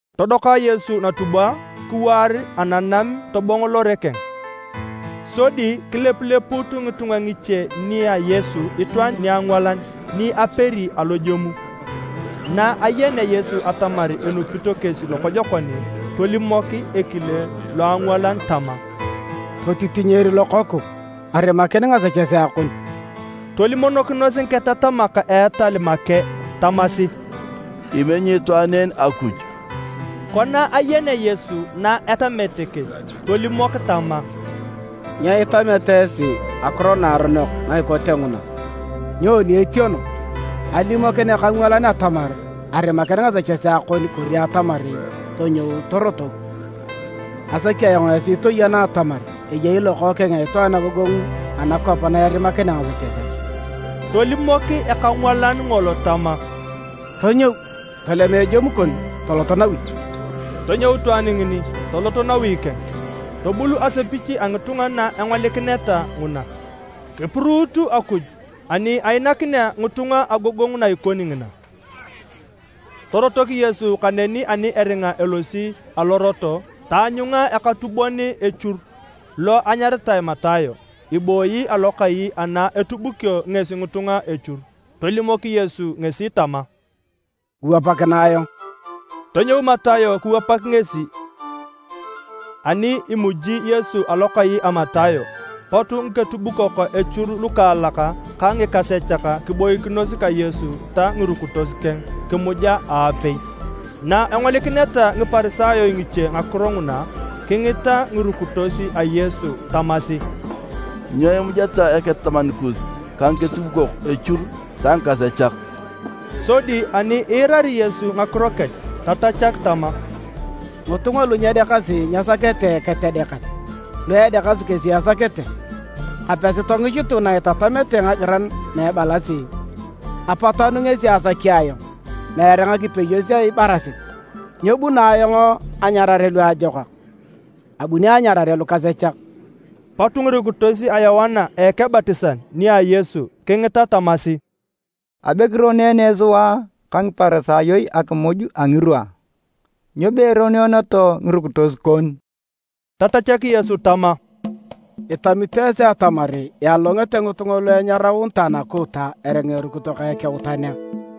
Todoka Yesu natubwa kiwaar ananam tobongo lore keng. Sodi kilepulepuut ngitunga ngiche nia Yesu itwaan niangwalan ni aperi alojemu. Na ayenea Yesu atamar enupito kesi lokojokon, tolimok ekile loangwalan tama, “Totitinyer lokooku, arimakin ngasechesea kon.” Tolimokinos ngiketatamak a etal make tamasi, “Imenyi itwaan en Akuj.” Kona ayenea Yesu na etamete kesi tolimok tama, “Nyo itameta esi ngakiro naaronok na ikote nguna? Nyoni etieno, alimokin ekangwalan atamar, ‘Arimakin ngasechesea kon’ kori atamar ‘Tonyou, torotok’? Asaki ayong esi toyena atamar eyei Lokookeng a Itwaan agogongu anakwap na erimakinea ngasechesea.” Tolimok ekangwalan ngolo tama, “Tonyou, tolema ejemu kon, tolot nawi.” Tonyou itwaan ngini, tolot nawi keng. Tobul asepich a ngitunga na engolikineta nguna. Kipuruut Akuj ani ainakinea ngitunga agogongu na ikoni ngina. Torotok Yesu kaneni ani eringa elosi alorot, taanyunga eketubukon echur lo anyaritae Matayo, ibooyi alokai ana etubukio ngesi ngitunga echur. Tolimok Yesu ngesi tama, “Kiwapakinae ayong.” Tonyou Matayo kiwapak ngesi. Ani imuji Yesu alokai a Matayo, pot ngiketubukok echur lukaalak ka ngikasechak kiboikinos ka Yesu ta ngirukitos keng kimuja aapei. Na engolikineta Ngiparisayo ngiche ngakiro nguna, kingita ngirukitos a Yesu tamasi, “Nyo imujeta eketataman kus ka ngiketubukok echur ta ngikasechak?” Sodi ani iirari Yesu ngakiro kech tatachak tama, “Ngitunga lu nyedeakasi nyesakete eketedeakan. Lu edeakasi kesi esakete. Kapesi tongichitu na itatamete ngagiran na ebalasi: ‘Apatanu ngesi asaki ayong, meere ngakipeyos a ibarasit’. Nyebuno ayong anyarare luajokak. Abuni anyarare lukasechak.” Pot ngirukitos a Yoana Ekebatisan nia Yesu kingita tamasi, “Abe kironeene sua ka Ngiparisayo akimuj a ngirwa. Nyo peeroneeneto ngirukitos kon?” Tatachak Yesu tama, “Itamito esi atamar ialolongete ngitunga lu enyaraunitae nakuuta eringa erukito ka ekeutan a?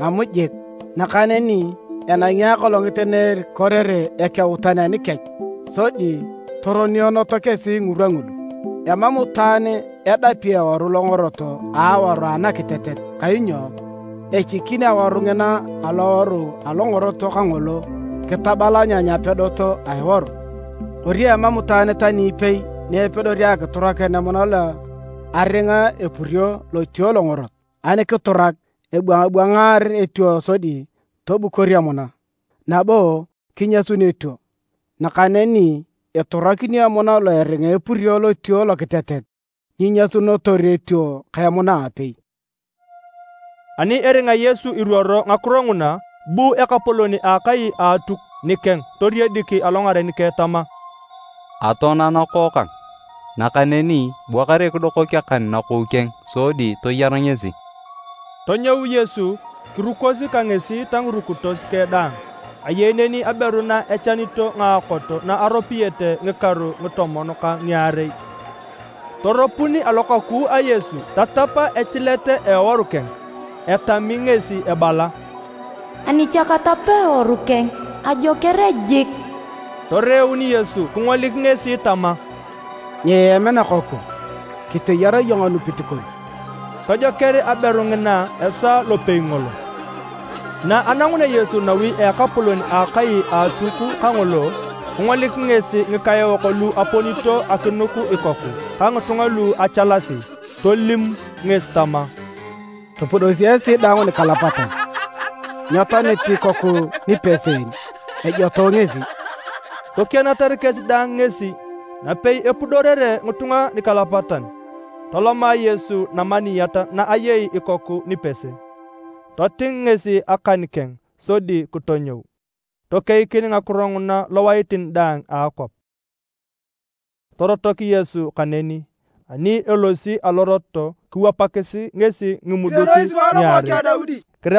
Mam jik! Nakaneni enangi akolongit na erikorere ekeutan anikech sodi toroneeneto kesi ngirwa ngulu. “Emam itwaan edapi eworu longorot a aworu anakitetet kainyo echikin aworu ngina aloworu alongorot kangolo kitabalanyany apedot a eworu. Kori emam itwaan tani ipei ni epedori akiturakin emuna lo aringa epurio lotuo longorot. Ani kiturak, ebwangabwangaar etuo sodi tobukor emuna, nabo kinyasun etuo. Nakaneni iturakinio emuna lo eringa epurio lotuo lokitetet nyiinyasunotor etuo ka emuna aapei.” Ani eringa Yesu iruoro ngakiro nguna, bu ekapolon a akai a Atuk nikeng toriedik alongaren keng tama, “Atoana nakookang, nakaneni bua kare kidokok akan nakou keng sodi toyar ngesi.” Tonyou Yesu kirukosi ka ngesi ta ngirukitos keng daang. Ayei neni aberu na echanito ngaakot na aropiyete a ngikaru a ngitomon ka ngiarei, toropun alokaku a Yesu tatap echilet a eworu keng. Etami ngesi ebala, “Ani cha katap eworu keng, ajoker jik.” Toreeun Yesu kingolik ngesi tama, “Nyiem nakooku, kiteyar iyong anupit kon.” Tojoker aberu ngina esaa lopei ngolo. Na anangunea Yesu nawi a ekapolon a akai a Atuk kangolo, kingolik ngesi ngikaeok lu aponito akinuk ikoku ka ngitunga lu achalasi. Tolim ngesi tama, “Topudosi esi daang nikalapatan. Nyetoanit ikoku nipese en, ejotoe ngesi!” Tokianatar kesi daang ngesi. Napei epudorere ngitunga nikalapatan, toloma Yesu namaniyat na ayei ikoku nipese, toting ngesi akan keng sodi kitonyou. Tokeikin ngakiro nguna lowaitin daang a akwap. Torotok Yesu kaneni. Ani elosi alorot kiwapakis ngesi ngimuduk ngiarei. Kiremasi ebalasi, “Kisienoi sua Lokookeng a Daudi.”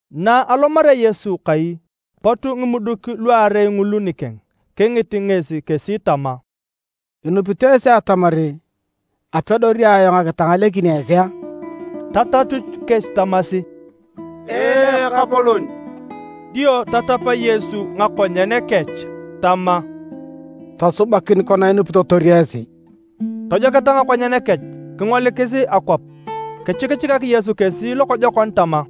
Na alomarea Yesu kai, pot ngimuduk luarei ngulu nikeng. Kingit ngesi kesi tama, “Inupito esi atamar apedori ayong akitangalekin esi a?” Tatachut kesi tamasi, “Ee, Ekapolon!” Dio tatap Yesu ngakonyen kech tama, “Tosubakin kona inupitotor esi.” Tojoketa ngakonyen kech kingolikis akwap. Kichikichikak Yesu kesi lokojokon tama,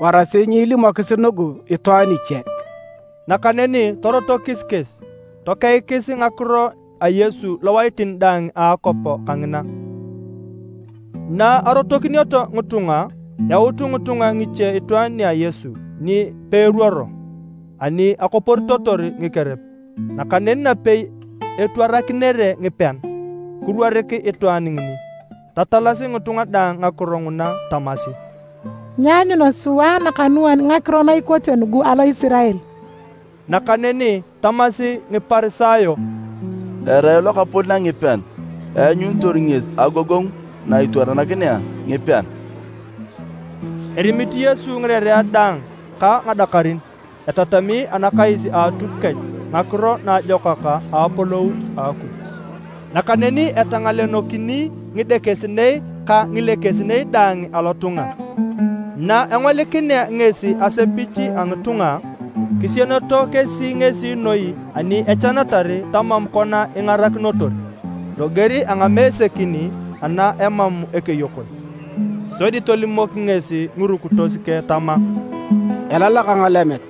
“Warasi nyiilimokis nugu itwaan iche.” Nakaneni torotokis kesi tokeikis ngakiro a Yesu lowaitin daang a akwap kangina. Na arotokinioto ngitunga, yaut ngitunga ngiche itwaan nia Yesu ni peeruoro ani akoporitotor ngikerep. Nakaneni napei etwarakinere ngipean, kiruorik itwaan ngini, tatalasi ngitunga daang ngakiro nguna tamasi, “Nyeanyuna sua nakanuan ngakiro na ikote nugu alo Isirael!” Nakaneni tamasi Ngiparisayo, “Erai lokapolon a ngipean eanyunitor ngesi agogongu na itwaranakinea ngipean.” Erimit Yesu ngirerea daang ka ngadakarin. Etatami anakais a Atuk kech Ngakiro Naajokak a Apolou a Akuj. Nakaneni etangalenokini ngidekesinei ka ngilekesinei daang alotunga. Na engolikinea ngesi asepich a ngitunga, kisienoto kesi ngesi noi ani echanatar tamam kona ingarakinotor, loger a ngamesekin ana emam ekeyokon. Sodi tolimok ngesi ngirukitos keng tama, “Elalak ngalemet,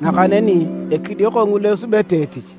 nakaneni ekidioko ngulu esubete etich.